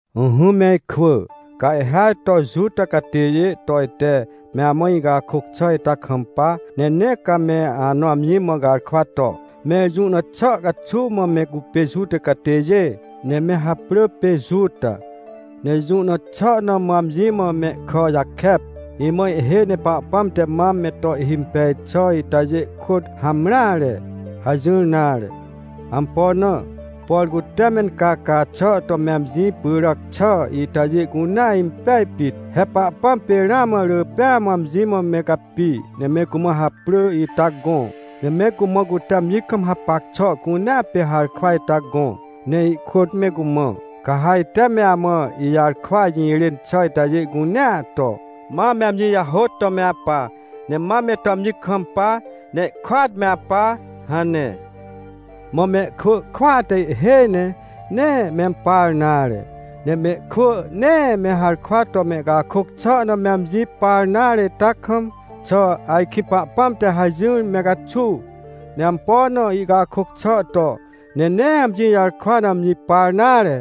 Ỹhỹ me ikwỳ, ca ihhêaj to Juta catêjê to ite me amã icakôc xà ita kampa, ne nee ca me anõ amji mã garkwa to: — Mẽr jũ na xà caxuw mã me cupê Juta catêjê? Ne me haprỳ pê Juta, ne jũ na xà na mã amji mã mehkà jakep? Imã ihhêj ne Pahpãm te mam me to ihhimpej xà itajê kôt hamreare — hajỹr nare. Ampo na? Por cute mencaca xà to me amji pyràc xà itajê cunea impej pit. He Pahpãm pê ramã rỳ pêa mã amji mã me capi, ne me cumã haprỳ ita gõ, ne me cumã cute amji kam hapac xà cunea pê harkwa ita gõ. Ne ihkôt me cumã: “Ca ha ite me amã ijarkwa jirên xà itajê cunea to, ma me amji jahôt to me apa, ne ma me to amji kampa, ne ihkôat me apa” hane. Mã mehkwỳ kwỳa te ihhêj ne, nee mempar nare. Ne mehkwỳ nee me harkwa to mehcakôc xà na me amji par nare ita kam, xà ajkĩ Pahpãm te hajỹar me caxuw, ne ampo na ihcakôc xà to, ne nee amji jarkwa na amji par nare?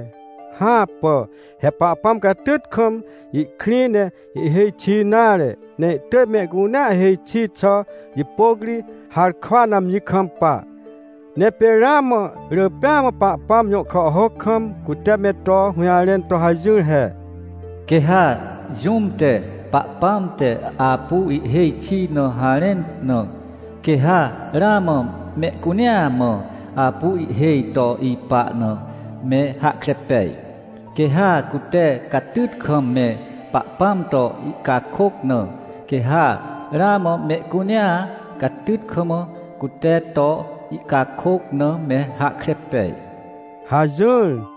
Hãpà! He Pahpãm catyt kam ihkrĩ, ne ihhêj xi nare, ne ihtỳj mehcunea hêj xi xà jipôc ri harkwa na amji kampa. Ne pê ramã rỳ pêa mã Pahpãm jõ kàhhôc kam, cute me to hũjarẽn to hajỹr he: “Quê ha jũm te, Pahpãm te apu ihhêj xi na harẽn na, quê ha ramã mehcunea mã apu ihhêj to ipa na me hahkre pej. Quê ha cute catyt kam me Pahpãm to ihcakôc na, quê ha ramã mehcunea catyt kam, cute to ihcakôc na me hahkre pej” hajỹr.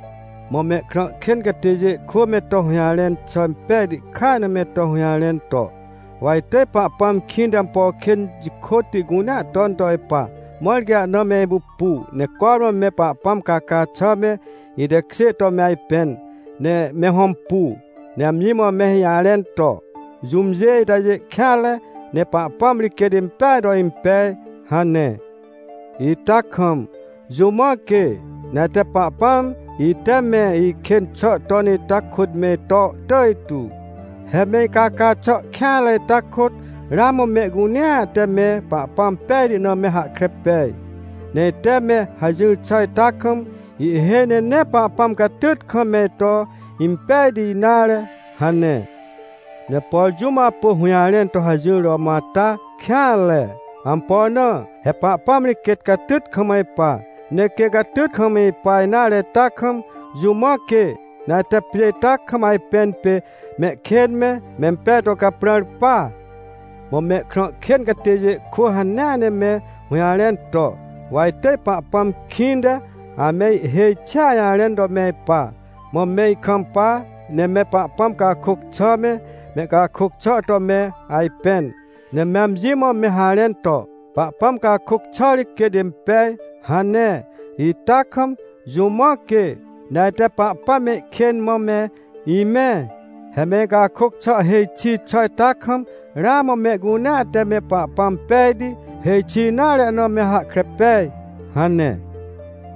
Mã mehkrã kên catêjê kwỳ me to hũjarẽn xà impejti kaj na me to hũjarẽn to: — Wa itỳj Pahpãm kĩnte ampo kên jikôtti cunea ton to ipa, mãr quê ahna me ipupu, ne cormã me Pahpãm caca xà me, itekjê to me ajpẽn, ne me hõmpu, ne amji mã me ijarẽn to: “Jũmjê itajê kêanre, ne Pahpãm ri quêt impeaj to impej” hane. Ita kam, jũ mã quê, ne ajte Pahpãm ite me ikên xà ton ita kôt me ito tỳj tu? He me icaca xà kêanre ita kôt, ramã mehcunea te me Pahpãm pejti na me hahkre pej. Ne ite me hajỹr xà ita kam, ihhêj ne nee Pahpãm catyt kam me ito impejti nare — hane. Ne por jũm apu hũjarẽn to hajỹr to mõ ata kêanre. Ampo na? He Pahpãm ri quêt catyt kam ipa. Ne quê catyt kam ipa nare ita kam, jũ mã quê, ne ajte pjê ita kam ajpẽn pê mehkên me, mempej to caprãr pa? Mã mehkrã kên catêjê kwỳ hanea ne me hũjarẽn to: — Wa itỳj Pahpãm kĩnte ame ihêj xia jarẽn to me ipa, mã me ikampa, ne me Pahpãm cakôc xà me, me icakôc xà to me ajpẽn, ne me amji mã me harẽn to: “Pahpãm cakôc xà ri quêt impej” hane ita kam, jũ mã quê, ne ajte Pahpãm me ikên mã me imẽ? He me icakôc xà hêj xi xà ita kam, ramã mehcunea te me Pahpãm pejti, hêj xi nare na me hahkre pej — hane.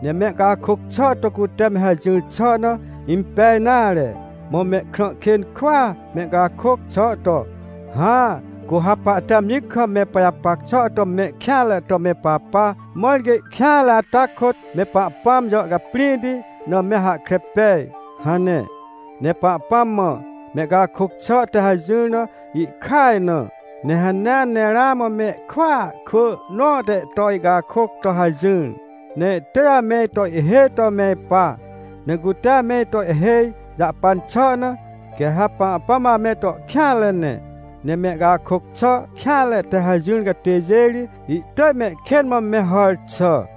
Ne mehcakôc xà to cute me hajỹr xà na impej nare. Mã mehkrã kên kwỳa mehcakôc xà to: — Hã, cu ha pahte amji kam me pajapac xà to me kêanre to me papa, mãr quê ihkêanre ata kôt, me Pahpãm jàhcaprĩhti na me hahkre pej — hane. Ne Pahpãm mã mehcakôc xà te hajỹr na ihkaj na. Ne hanea ne ramã mehkwỳa kwỳ nõ te ito ihcakôc to hajỹar. Ne ihtỳj ame ito ihhêj to me ipa. Ne cute ame ito ihhêj jahpan xà na, quê ha Pahpãm ame to kêanre ne. Ne mehcakôc xà kêanre te hajỹr catêjê ri, ihtỳj mehkên mã me hàr xà.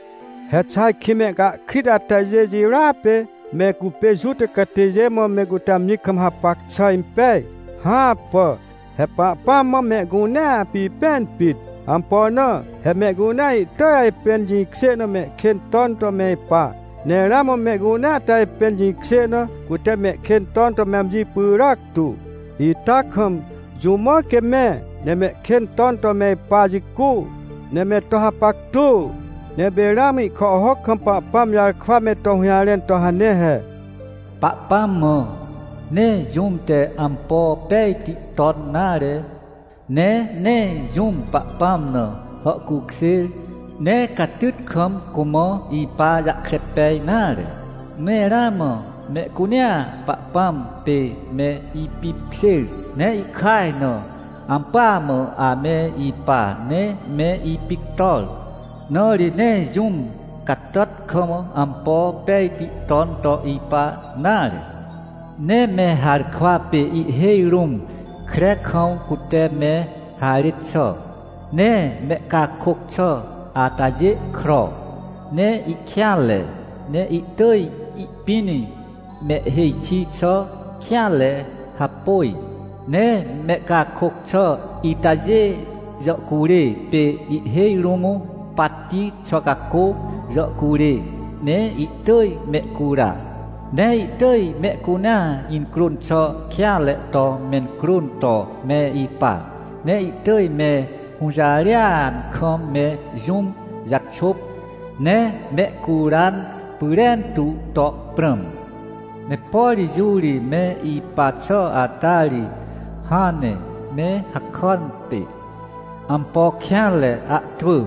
He xà ajkĩ mehcahkrit atajê jirôa pê, me cupê Juta catêjê mã me cute amji kam hapac xà impej? Hãpà! He Pahpãm mã mehcunea pipẽn pit. Ampo na? He mehcunea ihtỳj ajpẽn jĩkjê na mehkên ton to me ipa. Ne ramã mehcunea te ajpẽn jĩkjê na, cute mehkên ton to me amji pyràc tu, ita kam, jũ mã quê me, ne mehkên ton to me ipa jicu, ne me to hapactu? Ne pê ramã ihkàhhôc kam Pahpãm jarkwa me to hũjarẽn to hane he: “Pahpãm mã, nee jũm te ampo pejti ton nare. Ne nee jũm Pahpãm na hàhcukjêr, ne catyt kam cumã ipa jahkre pej nare. Ne ramã mehcunea Pahpãm pê me ipipkjêr, ne ihkaj na ampỳa mã ame ipa, ne me ipictor. Na ri nee jũm catàt kam, ampo pejti ton to ipa nare. Ne me harkwa pê ihhêj rũm kre kam, cute me harêt xà. Ne mehcakôc xà atajê kro, ne ihkêanre, ne ihtỳj ihpĩn mehhêj xi xà kêanre hapôj. Ne mehcakôc xà itajê jàhcurê pê ihhêj rũm patti xwa cacô jàhcurê, ne ihtỳj mehcura. Ne ihtỳj mehcunea incrôn xà kêanre to mencrôn to me ipa. Ne ihtỳj me hũjarêan kam me jũm jaxôp, ne mehcuran pyrentu to prãm. Ne por jũ ri me ipa xà ata ri, hãn ne me hakàn pê ampo kêanre ahtwỳ.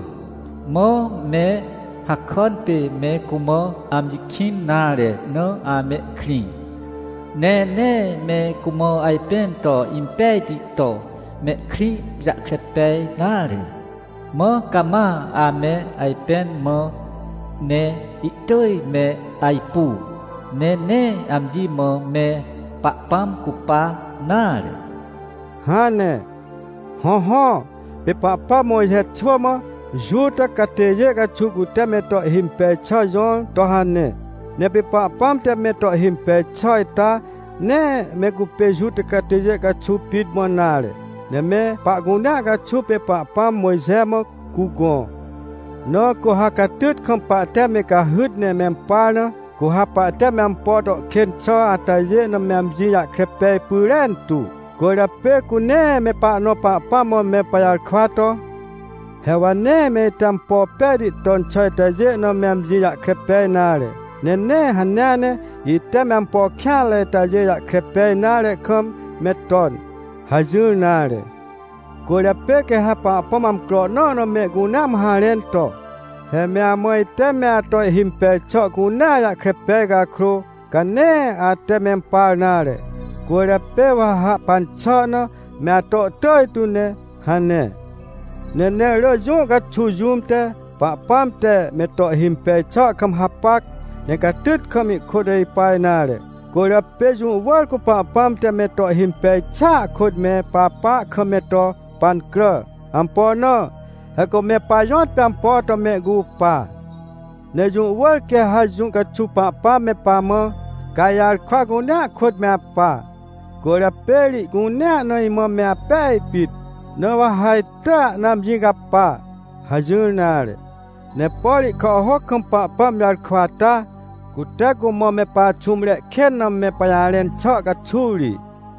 Mã me hakàn pê me cumã amji kĩn nare na amehkrĩ. Ne nee me cumã ajpẽn to impejti to mehkrĩ jahkre pej nare. Mã cama ame ajpẽn mã, ne ihtỳj me ajpu. Ne nee amji mã me Pahpãm cupa nare” hane. Hõhõ, pê Pahpãm Mojxe xwỳ mã Juta catêjê caxuw cute me to ihhimpej xà jõr to hane. Ne pê Pahpãm te me to ihhimpej xà ita, nee me cupê Juta catêjê caxuw pit mã nare, ne me pahcunea caxuw pê Pahpãm Mojxe mã cugõ. Na cu ha catyt kam pahte me cahyt ne mempar na, cu ha pahte me ampo to kên xà atajê na me amji jahkre pej pyrentu. Cwỳrjapê cu nee me pahnõ Pahpãm mã me pajarkwa to: — He wa nee me ite ampo pejti ton xà itajê na me amji jahkre pej nare. Ne nee hanea ne ite me ampo kêanre itajê jahkre pej nare kam me ton — hajỹr nare. Cwỳrjapê quê ha Pahpãm amcro nõ na mehcunea mã harẽn to: — He me amã ite me ato ihimpej xà cunea jahkre pej cakrô, ca nee ate mempar nare, cwỳrjapê wa ha hahpan xà na me ato tỳj tu ne — hane. Ne nee rỳ jũ caxuw jũm te, Pahpãm te me to ihhimpej xà kam hapac, ne catyt kam ihkôt ipa nare. Cwỳrjapê jũ wỳr cu Pahpãm te me to ihhimpej xàa kôt me papa kam me to pancrà. Ampo na? He cu me pajõtpê ampo to mehcupa. Ne jũ wỳr quê ha jũ caxuw Pahpãm me pamã: — Ca ijarkwa cunea kôt me apa, cwỳrjapê ri ihcunea na imã me apej pit, na wa ha itỳj ana amji capa — hajỹr nare. Ne por ihkàhhôc kam Pahpãm jarkwa ata, cute cumã me paxũmre kên na me pajarẽn xà caxuw ri.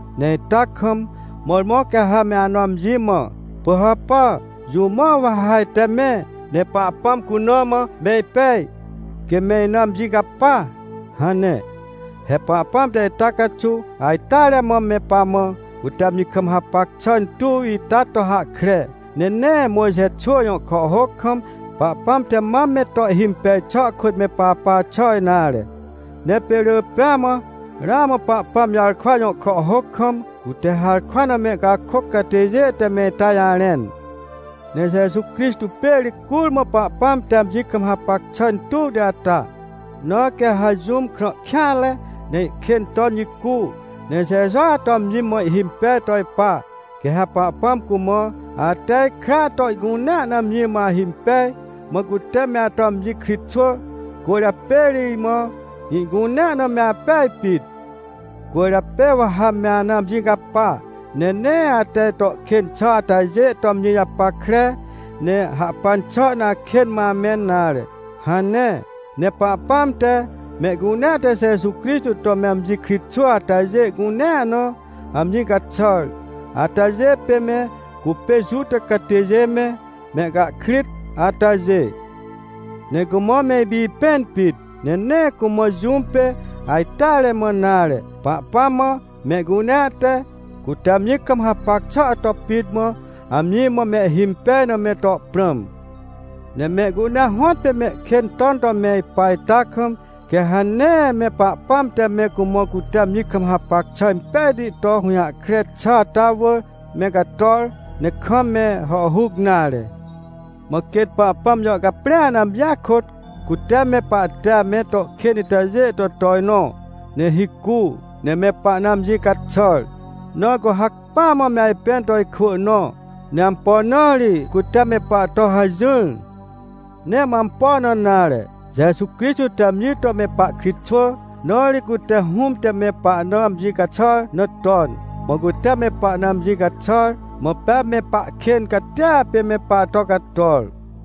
Ne ita kam, mõrmõ ca ha me anõ amji mã: — Pỳhàpà, jũ mã wa ha ajte me, ne Pahpãm cuna mã me ipej, quê me ina amji capa? — hane. He Pahpãm te ita caxuw ajteare mã me pamã, cute amji kam hapac xà intuw ita to hahkre, ne nee Mojxe xwỳ jõ kàhhôc kam Pahpãm te mam me to ihhimpej xà kôt me papa xà nare. Ne pê rỳ pêa mã ramã Pahpãm jarkwa jõ kàhhôc kam, cute harkwa na mehcakôc catêjê te me ita jarẽn. Ne Jeju Crixtô pê ri curmã Pahpãm te amji kam hapac xà intuwti ata. Na quê ha jũm krã kêanre, ne ihkên ton jicu, ne Jejua to amji mã ihhimpej to ipa, quê ha Pahpãm cumã: — Ate ikra to ihcunea na amji mã ahimpej, mã cute me ato amji kritxwỳ, cwỳrjapê ri imã ihcunea na me apej pit. Cwỳrjapê wa ha me ana amji capa, ne nee ate ito kên xà atajê to amji japackre, ne hahpan xà na akên mã amẽn nare — hane. Ne Pahpãm te, mehcunea te Jeju Crixtô to me amji kritxwỳ atajê cunea na, amji caxàr, atajê pê me cupê Juta catêjê me, mehcahkrit atajê. Ne cumã me ipipẽn pit, ne nee cumã jũm pê ajteare mã nare. Pahpãm mã mehcunea te, cute amji kam hapac xà to pit mã, amji mã mehhimpej na me to prãm. Ne mehcunea hõtpê mehkên ton to me ipa ita kam, quê ha nee me Pahpãm te me cumã cute amji kam hapac xà impejti to hũjahkre xà ata wỳr me cator, ne kam me hàhhuc nare. Mã quêt Pahpãm jàhcaprĩa na amjia kôt cute me pahte ame to kên itajê to tojnõ, ne hicu, ne me pahna amji caxàr, na cu hacpỹa mã me ajpẽn to ikwỳ nõ. Ne ampo na ri cute me pahto hajỹr? Nee mã ampo na nare, Jeju Crixtô te amji to me pahkritxwỳ, na ri cute Hũm te me pahna amji caxàr na ton, mã cute me pahna amji caxàr, mã pea me pahkên catia pê me pahto cator.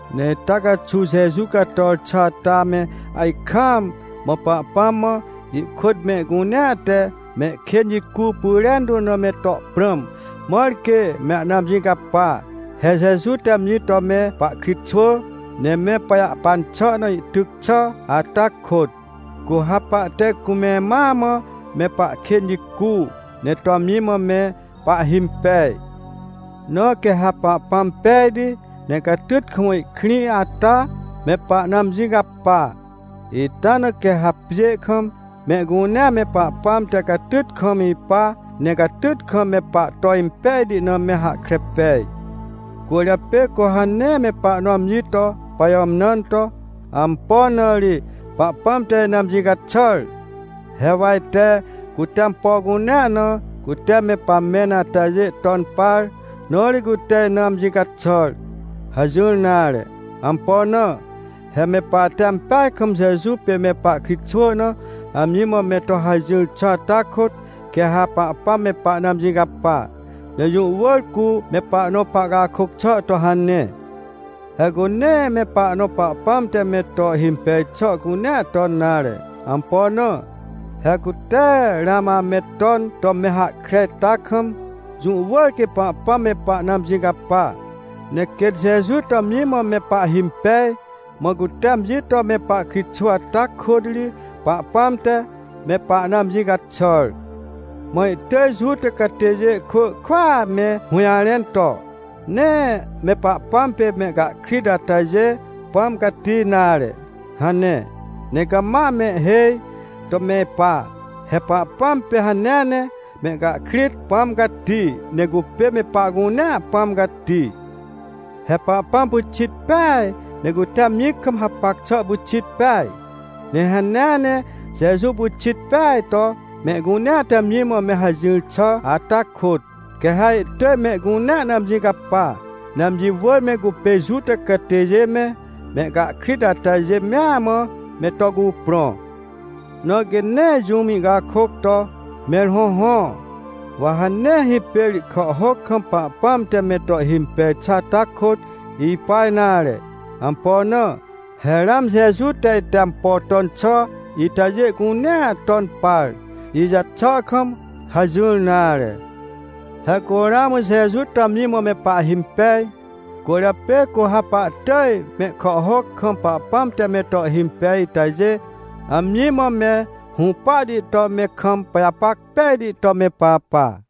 Ne ita caxuw Jeju cator xà ata me ajkaam, mã Pahpãm mã ihkôt mehcunea te mehkên jicu pyrentu na me to prãm, mãr quê me ahna amji capa. He Jeju te amji to me pahkritxwỳ. Ne me pajahpan xà na ihtyc xà ata kôt, cu ha pahte cume mãa mã me pahkên jicu, ne to amji mã me pahhimpej. Na quê ha Pahpãm pejti, ne catyt kam ihkrĩ ata, me pahna amji capa. Ita na quê ha pjê kam, mehcunea me Pahpãm te catyt kam ipa, ne catyt kam me pahto impejti na me hahkre pej. Cwỳrjapê cu ha nee me pahnõ amji to pajàmnãn to: — Ampo na ri Pahpãm te ina amji caxàr? He wa ite, cute ampo cunea na, cute me pamẽn atajê ton par, na ri cute ina amji caxàr — hajỹr nare. Ampo na? He me pahte ampeaj kam Jeju pê me pahkritxwỳ na amji mã me to hajỹr xà ata kôt, quê ha Pahpãm me pahna amji capa. Ne jũ wỳr cu me pahnõ pahcakôc xà to hane. He cu nee me pahnõ Pahpãm te me to ihhimpej xà cunea ton nare. Ampo na? He cu tee ramã ame ton to me hahkre ita kam, jũ wỳr quê Pahpãm me pahna amji capa. Ne quêt Jeju to amji mã me pahhimpej, mã cute amji to me pahkritxwỳ ata kôt ri, Pahpãm te me pahna amji caxàr. Mã ihtỳj Juta catêjê kwỳ kwỳa me hũjarẽn to: — Nee me Pahpãm pê mehcahkrit atajê Pãm Cati nare — hane. Ne cama amehhêj to me ipa. He Pahpãm pê hanea ne, mehcahkrit Pãm Cati, ne cupê me pahcunea Pãm Cati. He Pahpãm pyxit peaj, ne cute amji kam hapac xà pyxit peaj. Ne hanea ne, Jeju pyxit peaj to mehcunea te amji mã me hajỹr xà ata kôt, quê ha ihtỳj mehcunea na amji capa, ne amji wỳr me cupê Juta catêjê me, mehcahkrit atajê mea mã me to cuprõ. Na quê nee jũm ihcakôc to: — Mẽr hõhõ, wa ha nee hipêr ihkàhhôc kam Pahpãm te me to ihhimpej xà ata kôt ipa nare. Ampo na? He ramã Jeju te ite ampo ton xà itajê cunea ton par, ijaxà kam — hajỹr nare. He cu ramã Jeju to amji mã me pahhimpej, cwỳrjapê cu ha pahtỳj mehkàhhôc kam Pahpãm te me to ihhimpej itajê, amji mã me hũpahti to me kam pajapac pejti to me papa.